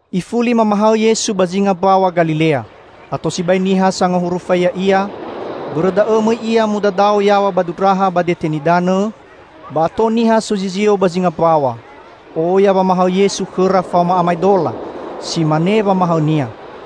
Ifuli mamahaõ Yesu ba zinga Mbaw̃a Galilea. Ato sibai niha sangahurufai Ya'ia. Bõrõ da'õ, mõi Ia mudadao yaw̃a ba dundraha ba dete nidanõ, ba ato niha sozizio ba zinga mbaw̃a. Oya wamahaõ Yesu khõra faoma amaedola. Si mane wamahaõ-Nia.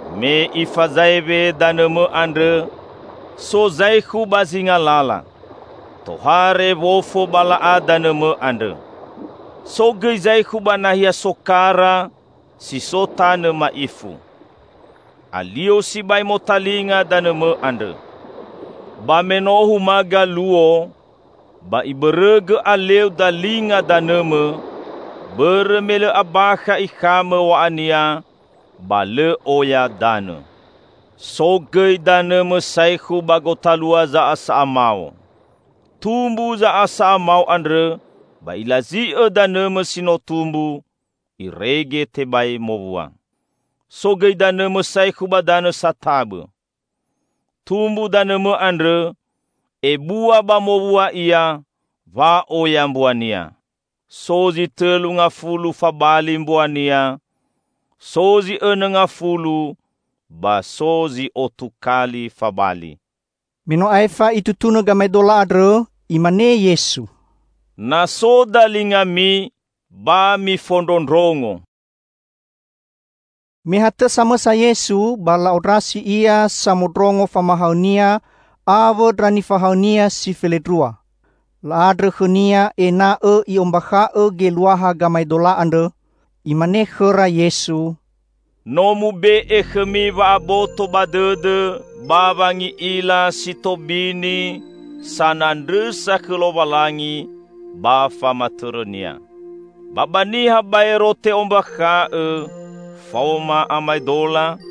Me ifazaewe danõmõ andrõ, so zaekhu ba zinga lala. Tohare wofo ba la'a danõmõ andrõ. So gõi zaekhu ba nahia sokara si so tanõ ma'ifu. Alio sibai motalinga danõmõ andrõ. Ba meno humaga luo, ba ibõrõgõ aleu dalinga danõmõ bõrõ me lõ abakha ikhamõ w̃a'ania ba lõ oya danõ. So gõi danõmõ saekhu ba gotalua za'asa'a mao. Tumbu za'asa'a mao andrõ ba ilazi'õ danõmõ si no tumbu, irege tebai mowua. So gõi danõmõ saekhu ba danõ satabõ. Tumbu danõmõ andrõ, ebua ba mowua ia, wa'oya mbuania: so zi tõlu ngafulu fabali mbuania, so zi õnõ ngafulu ba so zi otu kali fabali." Me no aefa Itutunõ gamaedola andrõ, Imane Yesu, "Na so dalingami, ba mifondrondrongo!" Me hatõ samõsa Yesu, ba la'ondrasi Ia samondrongo famahaõ-Nia awõ ndra nifahaõ-Nia si felendrua. La'andrõ khõ-Nia ena'õ I'ombakha'õ geluaha gamaedola andrõ. Imane khõra Yesu, "No mube'e khõmi wa'aboto ba dõdõ ba wangi'ila si tobini sanandrõsa khõ Lowalangi ba famatõrõ-Nia. Ba ba niha baero te'ombakha'õ faoma amaedola,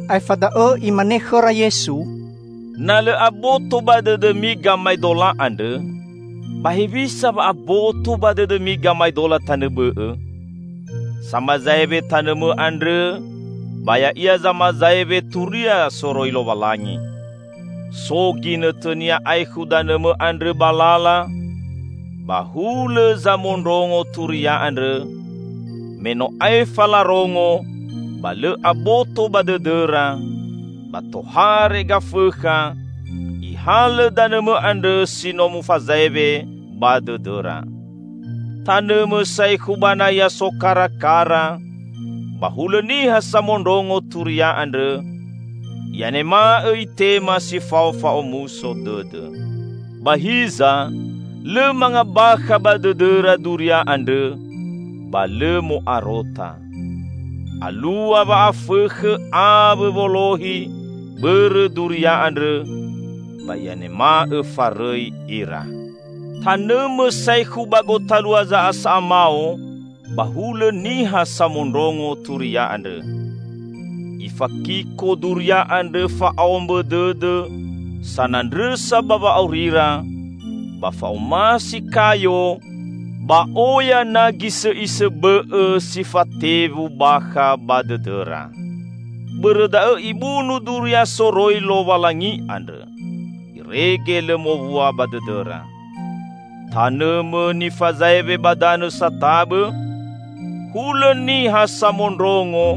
Aefa da'õ Imane khõra Yesu, "Na lõ aboto ba dõdõmi gamaedola andrõ, ba hewisa wa aboto ba dõdõmi gamaedola tanõ bõ'õ? Samazaewe tanõmõ andrõ ba ya'ia zamazaewe turia soroi Lowalangi. So ginõtõnia aekhu danõmõ andrõ ba lala, ba hulõ zamondrongo turia andrõ, me no aefa larongo ba lõ aboto ba dõdõra, ba tohare Gafõkha, ihalõ danõmõ andrõ si no mufazaewe ba dõdõra. Tanõmõ saekhu ba nahia sokarakara ba hulõ niha samondrongo turia andrõ, i'anema'õ itema si fao fa'omuso dõdõ. Ba hiza lõ mangabakha ba dõdõra duria andrõ, ba lõ mo'arota. Alua wa'afõkhõ awõ wolohi bõrõ duria andrõ, ba i'anema'õ farõi ira. Tanõmõ saekhu ba gotalua za'asa'a mao ba hulõ niha samondrongo turia andrõ. Ifakiko duria andrõ fa'aombõ dõdõ sanandrõsa ba wa'aurira, ba fa'omasi kayo, ba oya na gisõ'isõ bõ'õ si fatewu bakha ba dõdõra. Bõrõ da'õ ibunu duria soroi Lowalangi andrõ, irege lõ mowua ba dõdõra. Tanõmõ nifazaewe ba danõ satabõ, hulõ niha samondrongo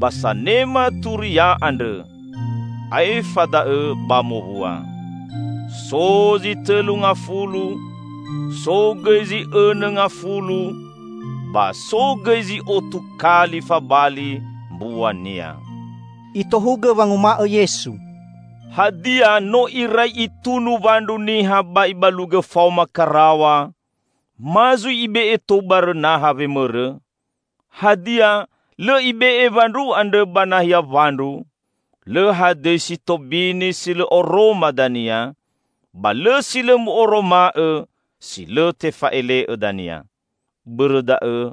ba sanema turia andrõ, aefa da'õ ba mowua; so zi tõlu ngafulu, so gõi zi õnõ ngafulu ba so gõi zi'otu kali fabali mbuania." Itohugõ wanguma'õ Yesu, "Hadia, no irai itunu wandru niha ba ibalugõ faoma karaw̃a, ma zui ibe'e tou barõ naha wemõrõ? Hadia, lõ ibe'e wandru andrõ ba nahia wandru? Lõ hadõi si tobini si lõ oroma dania; ba lõ si lõ mu'oroma'õ si lõ tefa'ele'õ dania. Bõrõ da'õ,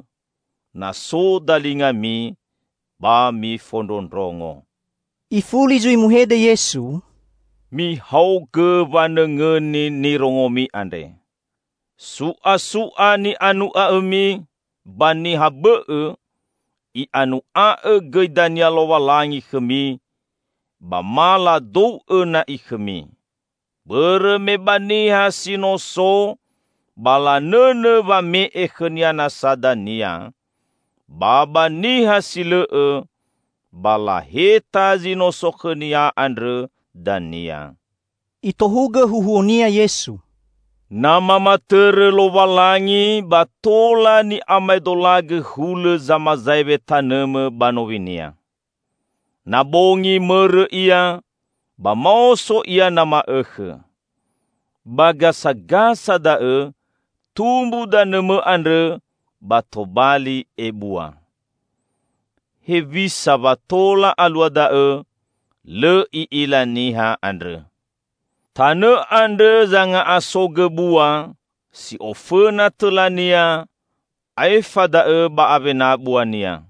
na so dalingami ba mifondrondrongo." Ifuli zui muhede Yesu, "Mihaogõ wanõngõni nirongomi andre! Su'asu'a ni'anu'a'õmi ba niha bõ'õ, i'anu'a'õ gõi dania Lowalangi khõmi ba ma ladou'õ na'i khõmi. Bõrõ me ba niha si no so ba lanõnõ wame'e khõnia nasa dania, ba ba niha si lõ'õ, ba laheta zi no so khõnia andrõ dania." Itohugõ huhuo-Nia Yesu, "Na mamatõrõ Lowalangi ba tola ni'amaedolagõ hulõ zamazaewe tanõmõ ba nowinia. Na bongi mõrõ ia, ba maoso ia na ma'õkhõ. Ba gasagasa da'õ tumbu danõmõ andrõ ba tobali ebua. Hewisa wa tola alua da'õ, lõ i'ila niha andrõ. Tanõ andrõ zanga'asogõ bua, si'ofõna tõlania, aefa da'õ ba awena buania.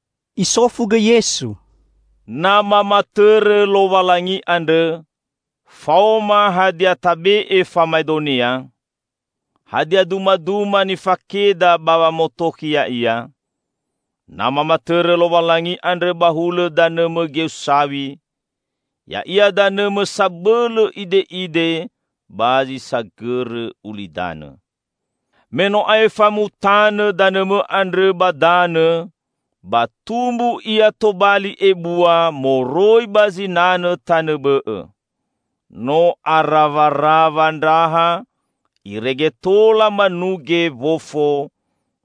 Isofu gõi Yesu, "Na mamatõrõ Lowalangi andrõ, faoma hadia tabe'e famaedonia? Hadia dumaduma nifakeda ba wamotokhi ya'ia? Na mamatõrõ Lowalangi andrõ ba hulõ danõmõ geu saw̃i, ya'ia danõmõ sabõlõ ide'ide ba zi sagõrõ ulidanõ. Me no aefa mutanõ danõmõ andrõ ba danõ, ba tumbu ia tobali ebua moroi ba zinanõ tanõ bõ'õ. No arawarawa ndraha irege tola manuge wofo,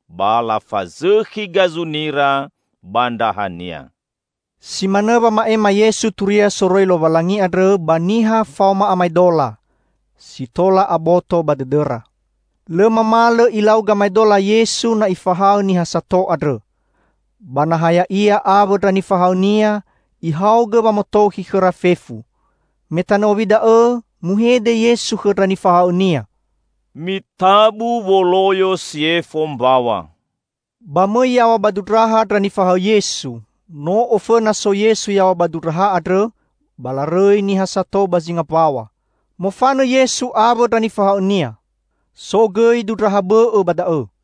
ba lafazõkhi gazunira ba ndrahania." Si manõ wama'ema Yesu turia soroi Lowalangi andrõ ba niha faoma amaedola, si tola aboto ba dõdõra. Lõ mamalõ Ilau gamaedola Yesu na Ifahaõ niha sato andrõ. Ba na ha Ya'ia awõ ndra nifahaõ-Nia, Ihaogõ wamotokhi khõra fefu. Me tanõ owi da'õ, muhede Yesu khõ ndra nifahaõ-Nia, "Mitabu woloyo si yefo mbaw̃a." Ba mõi yaw̃a ba dundraha ndra nifahaõ Yesu -- no ofõna so Yesu yaw̃a ba dundraha andrõ -- ba larõi niha sato ba zinga mbaw̃a. Mofanõ Yesu awõ ndra nifahaõ-Nia. So gõi dundraha bõ'õ ba da'õ.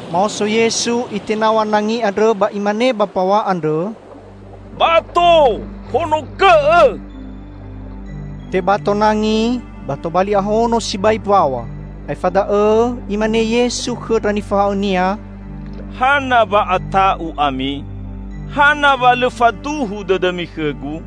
Maoso Yesu, Itenaw̃a nangi andrõ ba Imane ba mbaw̃a andrõ, "Bato, honogõ'õ!" Tebato nangi, ba tobali ahono sibai mbaw̃a. Aefa da'õ, Imane Yesu khõ ndra nifahaõ-Nia, "Hana wa ata'u ami? Hana wa lõ faduhu dõdõmi khõ-Gu?"